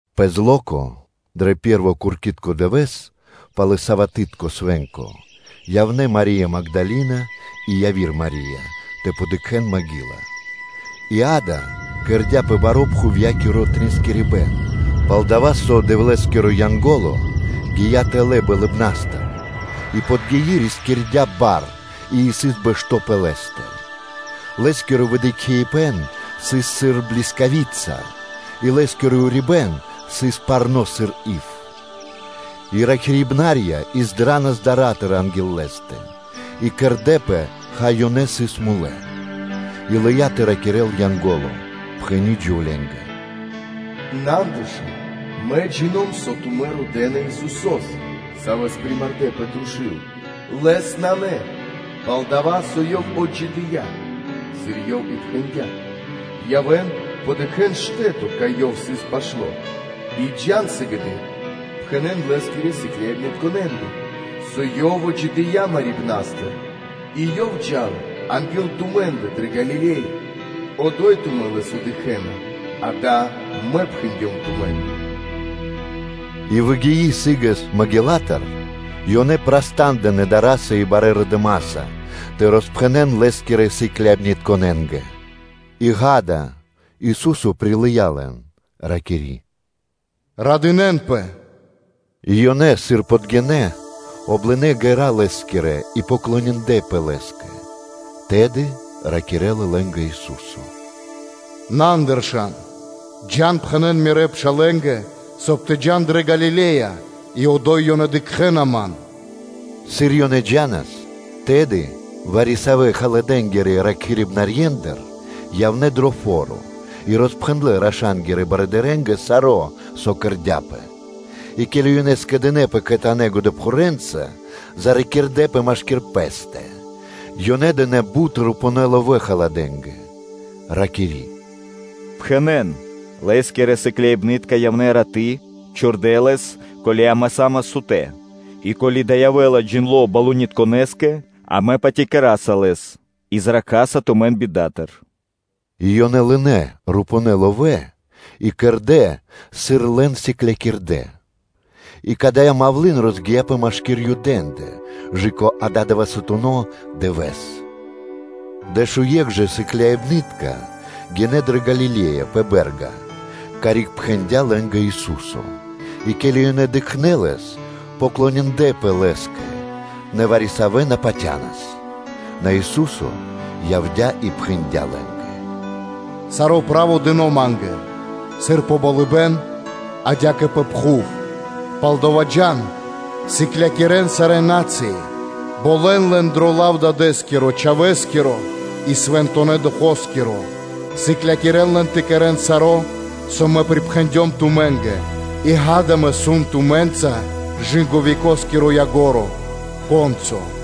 Пэ зло́ко, дро пэ́рво куркитко дывэ́с пало́ са́вато, явнэ́ Мари́я Магдалина и яви́р Мари́я тэ дыкхэ́н маґила дрэ копли́ца. И акэ, кэрдя́пэ баро́ пхувья́киро тринскирибэн; пал-дова́ со Дэвлэ́скиро Янго́ло гия́ тэлэ́ болыбна́стыр, и подгии, рискирдя́ бар и сыс бэшто́ пэ лэ́стэ. Лэ́скиро выдыкхибэн сыс сыр блискавица, и лэ́скиро урибэ́н сыс парно́ сыр ив. И ракхибна́рья издранас дара́тыр анги́л лэ́стэ, и кэрдэ́пэ, хай, ёнэ сыс мулэ́. И лыя́ тэ ракирэ́л Янго́ло, пхэни́ джувленгэ: “На андыршан; мэ джино́м (джина́в), со тумэ́ родэ́на Исусо́с, Савэс примардэ пэ трушу́л; Лэс (Ёв) нанэ ада́й, пал-дова́ со Ёв отджидыя́, сыр Ёв и пхэндя́. Явэ́н, подыкхэн штэ́то, кай Ёв сыс пашто́; и джа́н сыгэды́р, пхэнэ́н Лэ́скирэ сыкляибнытконэ́нгэ, со Ёв отджидыя́ мэрибна́стыр и Ёв джа́ла анги́л тумэ́ндэ дрэ Галиле́я, одо́й тумэ́ Лэс дыкхэ́на, акэ, мэ пхэндём тумэ́нгэ.” И выгии сы́гэс коплицатыр, ёнэ праста́ндынэ дара́са и барэ́ радыма́са тэ роспхэнэ́н Лэ́скирэ сыкляибнытконэ́нгэ. И, акэ, Ису́со пирилыя лэн, ракири́: “Радынэ́нпэ!” И ёнэ, сыр подгинэ́, облынэ ґэра́ Лэ́скирэ и поклониндлэпэ Лэ́скэ. Тэды ракирэ́ла лэ́нгэ Ису́со: “На андыршан; джа́н, и пхэнэ́н Мирэ́ пшалэ́нгэ, соб (кай) тэ джа́н дрэ Галиле́я; и одо́й ёнэ дыкхэ́на Ман.” Сыр ёнэ джа́нас, тэды вари-савэ́ халадэ́нгирэ ракхибнарьендыр явнэ́ дро фо́ро и роспхэндлэ́ раша́нгирэ барыдырэ́нгэ саро́, со кэрдя́пэ. И ке́ли ёнэ скэдынэ́пэ кхэтанэ́ годэпхурэнца, зракирдэпэ машки́р пэ́стэ; ёнэ дынэ́ бут рупувэ́ ловэ́ халадэнгэ, ракири́: “Пхэнэ́н: ‘Лэ́скирэ сыкляибны́тка явнэ́ раты́, чордэ Лэс, ке́ли амэ са́мас сутэ́.’ И ко́ли дава́ явэ́ла джиндло́ тхэмэ́скирэ барыдырэ́скэ, амэ патякира́са лэс и зракхаса тумэн пиридживипнастыр.” И ёнэ лынэ́ рупувэ́ ловэ́ и кэрдэ́, сыр лэн сыклякирдэ́. И кадая́ мавлы́н (малва) розгия́пэ машки́р Юдэ́ндэ кэ/жы́ко ададывэсатуно дывэ́с. Дэшуекх жа сыкляибны́тка гинэ́ дрэ Галиле́я пэ бэ́рга, карик пхэндя́ лэ́нгэ Ису́со. И ке́ли ёнэ дыкхнэ́ Лэс, поклониндлэпэ Лэ́скэ; нэ вари-савэ́ на патянас. На Ису́со явдя́ и пхэндя́ лэ́нгэ; “Саро́ право дыно́ Ма́нгэ, сыр пэ болыбэ́н, адя́кэ пэ пхув. Палдава́ джа́н, сыклякирэ́н сарэ́ на́цыи, болэн лэн дро лав Дадэ́скиро, Чхавэ́скиро и Свэнтонэ́ Духоскиро (Фаноскиро); сыклякирэ́н лэн тэ кэрэ́н саро́, со Мэ припхэндём тумэ́нгэ. И, акэ, Мэ сом тумэ́нца кэ векоскиро ко́нцо (яго́ро).”